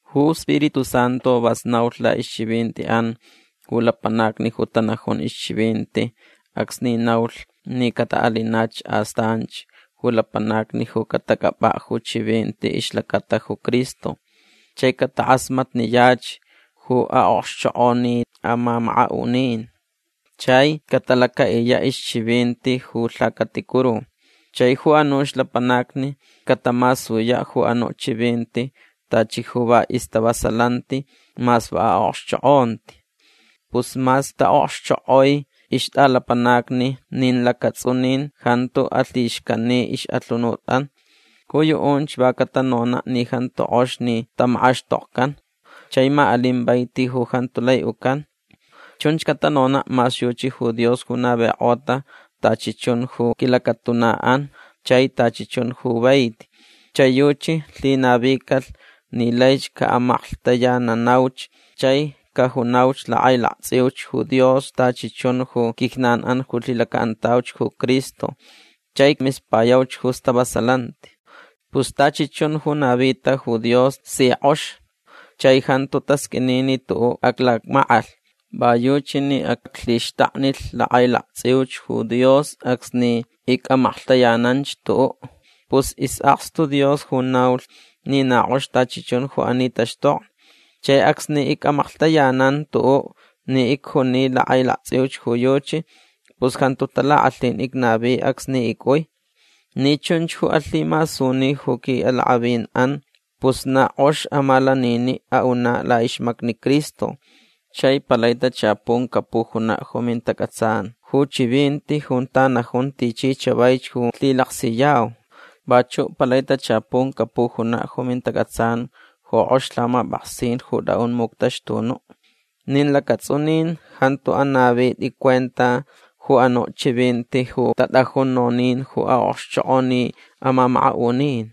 Ju Spiritu Santu vas naulh laʼixchivintiʼan ju lapanacni ju tanajun ixchivinti acsni naulh ni cataʼalinach astanch ju lapanacni ju catacʼapʼaʼ ju chivinti ixlacata ju Cristo. Chai catakʼasmatniyach ju aʼokxchokʼoni amamakaʼunin. Chai catalacaʼiyaʼ ixchivinti ju lhacaticuru. Chai ju anuch lapanacni catamasuyaʼ ju anuʼ chivinti tachi ju va istavasalanti mas va aʼokxchokʼonti. Pus mas taʼokxchokʼoi ixtʼalapanacni nin lacatsʼunin jantu alhixcani ixʼalhunutʼan. Ju yuʼunch va catanonaʼ ni jantu kʼox ni tamakʼaxtokcan chai ma alin vaiti ju jantu lai ucan. Chunch catanonaʼ mas yuchi ju Dios ju navikʼota tachi chun ju quilacatunaʼan chai tachi chun ju vaiti. Chai yuchi lhinavicalh ni laich caʼamaklhtayananauch chai cajunauch lakʼailaktsʼiuch ju Dios tachi chun ju quijnanʼan ju lhilacaʼantauch ju Cristo chai mispayauch ju stavasalanti. Pus tachi chun ju navita ju Dios si kʼox. Chai jantu tasqʼuini ni tuʼuʼ aclacmackʼalh. Va yuchi ni aclhixtaknilh lakʼailaktsʼiuch ju Dios acsni icʼamaklhtayananch tuʼuʼ. Pus isʼakstu Dios ju naulh ni na kʼox tachi chun ju ani taxtokni. Chai acsni icʼamaklhtayanan tuʼuʼ ni icjuni lakʼailaktsʼiuch ju yuchi pus jantu talakʼalhin icnavi acsni icʼui. Ni chunch ju alhimasuni ju quiʼalakʼavinʼan pus na kʼox amalaniniʼ aʼunaʼ laʼixmacni Cristo. Chai palai tachapun capujunaʼ ju mintacʼatsan ju chivinti junta najun tichi chavaich ju lhilaksiyau. Vachuʼ palai tachapun capujunaʼ ju mintacʼatsan ju kʼox lhamapʼaksin ju tʼaʼun muctaxtunuʼ. Nin lacatsʼunin jantu anavitʼi cuenta ju anuʼ chivinti ju tatʼajun nonin ju aʼokxchokʼoni amamakaʼunin.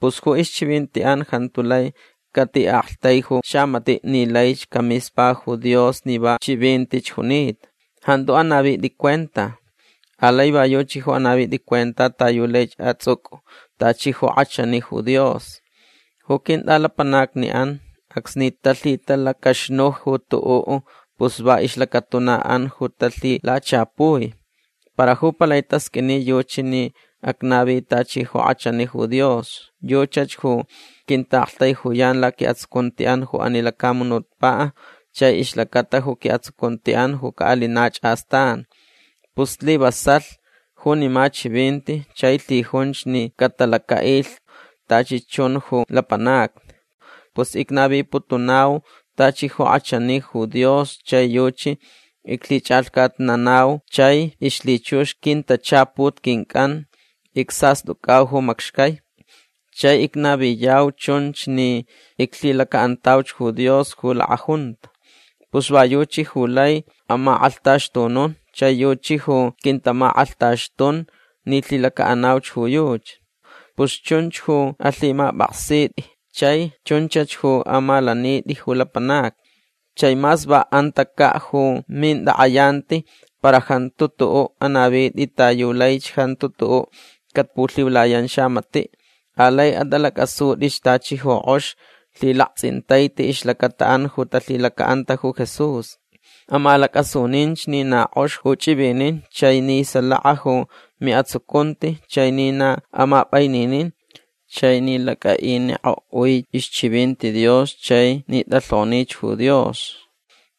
Pus ju ixchivintiʼan jantu lai catiʼaktaiju xamatiʼ ni laich camispa ju Dios ni va chivintich junita. Jantu anavitʼi cuenta. Alai va yuchi ju anavitʼi cuenta ta yu laich atsʼucʼu tachi ju kʼachani ju Dios. Ju quintʼalapanacniʼan acsni talhitalacaxnuj ju tuʼuʼ pus va ixlacatunaʼan ju talhilachapui. Para ju palai tasqʼuini yuchi ni acnavi tachi ju kʼachani ju Dios. Yuchach ju quintaʼaktaijuyan laquiʼatsucuntiʼan ju ani lacamunutpaʼ chai ixlacata ju quiʼatsucuntiʼan ju caʼalinach astan. Pus slivasalh junima chivinti chai lhijunch ni catalacaʼilh tachi chun ju lapanacni. Pus icnaviputunau tachi ju kʼachani ju Dios chai yuchi iclhichʼalhcatnanau chai ixlhichux quintachaput quincʼan icsastʼucʼau ju macxcai. Chai icnaviyau chunch ni iclhilacaʼantauch ju Dios ju lakʼajunta. Pus va yuchi ju lai amakʼalhtaxtunun chai yuchi ju quintamakʼalhtaxtun ni lhilacaʼanauch ju yuchi. Pus chunch ju alhimapʼaksitʼi chai chunchach ju amalanitʼi ju lapanacni. Chai mas va antacaʼ ju mintakʼayanti para jantu tuʼuʼ anavitʼi ta yu laich jantu tuʼuʼ capulhiulayan xamatiʼ. Alai atʼalacʼasutʼich tachi ju kʼox lhilaktsʼintaiti ixlacataʼan ju talhilacaʼanta ju Jesús. Amalacʼasuninch ni na kʼox ju chʼivinin chai ni salaka ju miʼatsucunti chai ni na amapʼaininin chai ni lacʼaʼinikʼoʼui ixchivinti Dios chai ni tʼalhonich ju Dios.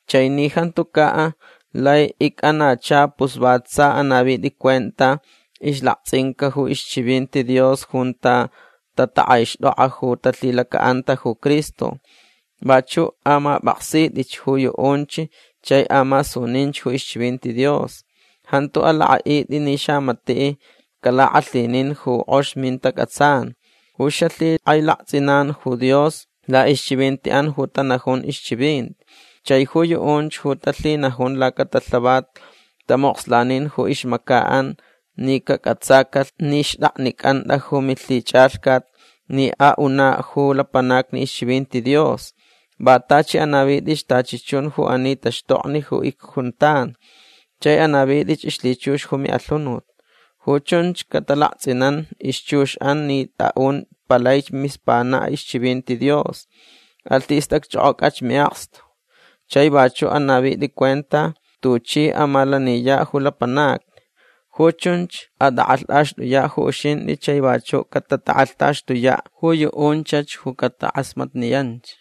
Chai ni jantucaʼ lai icʼanacha pus va tsa anavitʼi cuenta ixlaktsʼinca ju ixchivinti Dios junta tatakʼaixtʼokʼa ju talhilacaʼanta ju Cristo. Vachuʼ amapʼaksitʼich ju yuʼunch chai amasunin ju ixchivinti Dios. Jantu alakʼaʼitʼi ni xamatiʼ calakʼalhinin ju kʼox mintacʼatsan ju xalhikʼailaktsʼinan ju Dios laʼixchivintiʼan ju tanajun ixchivinti. Chai ju yuʼunch ju talhinajun lacatalhavat tamokslanin ju ixmacaʼan ni cacʼatsacalh ni xtʼaknicʼantʼa ju milhichʼalhcat ni aʼunaʼ ju lapanacni ixchivinti Dios. Va tachi anavitʼich tachi chun ju ani taxtokni ju icjuntan. Chai anavitʼich ixlhichux ju miʼalhunut. Ju chunch catalaktsʼinan ixchuxʼan ni tʼaʼun palaich mispanaʼ ixchivinti Dios. Alhistʼacchʼokʼocʼach miʼakstu. Chai vachuʼ anavitʼi cuenta tuchʼi amalaniyaʼ ju lapanacni. Ju chunch atʼakʼalhtʼaxtʼuyaʼ ju uxintʼi chai vachuʼ catatakʼalhtaxtuyaʼ ju yuʼunchach ju catakʼasmatniyanch.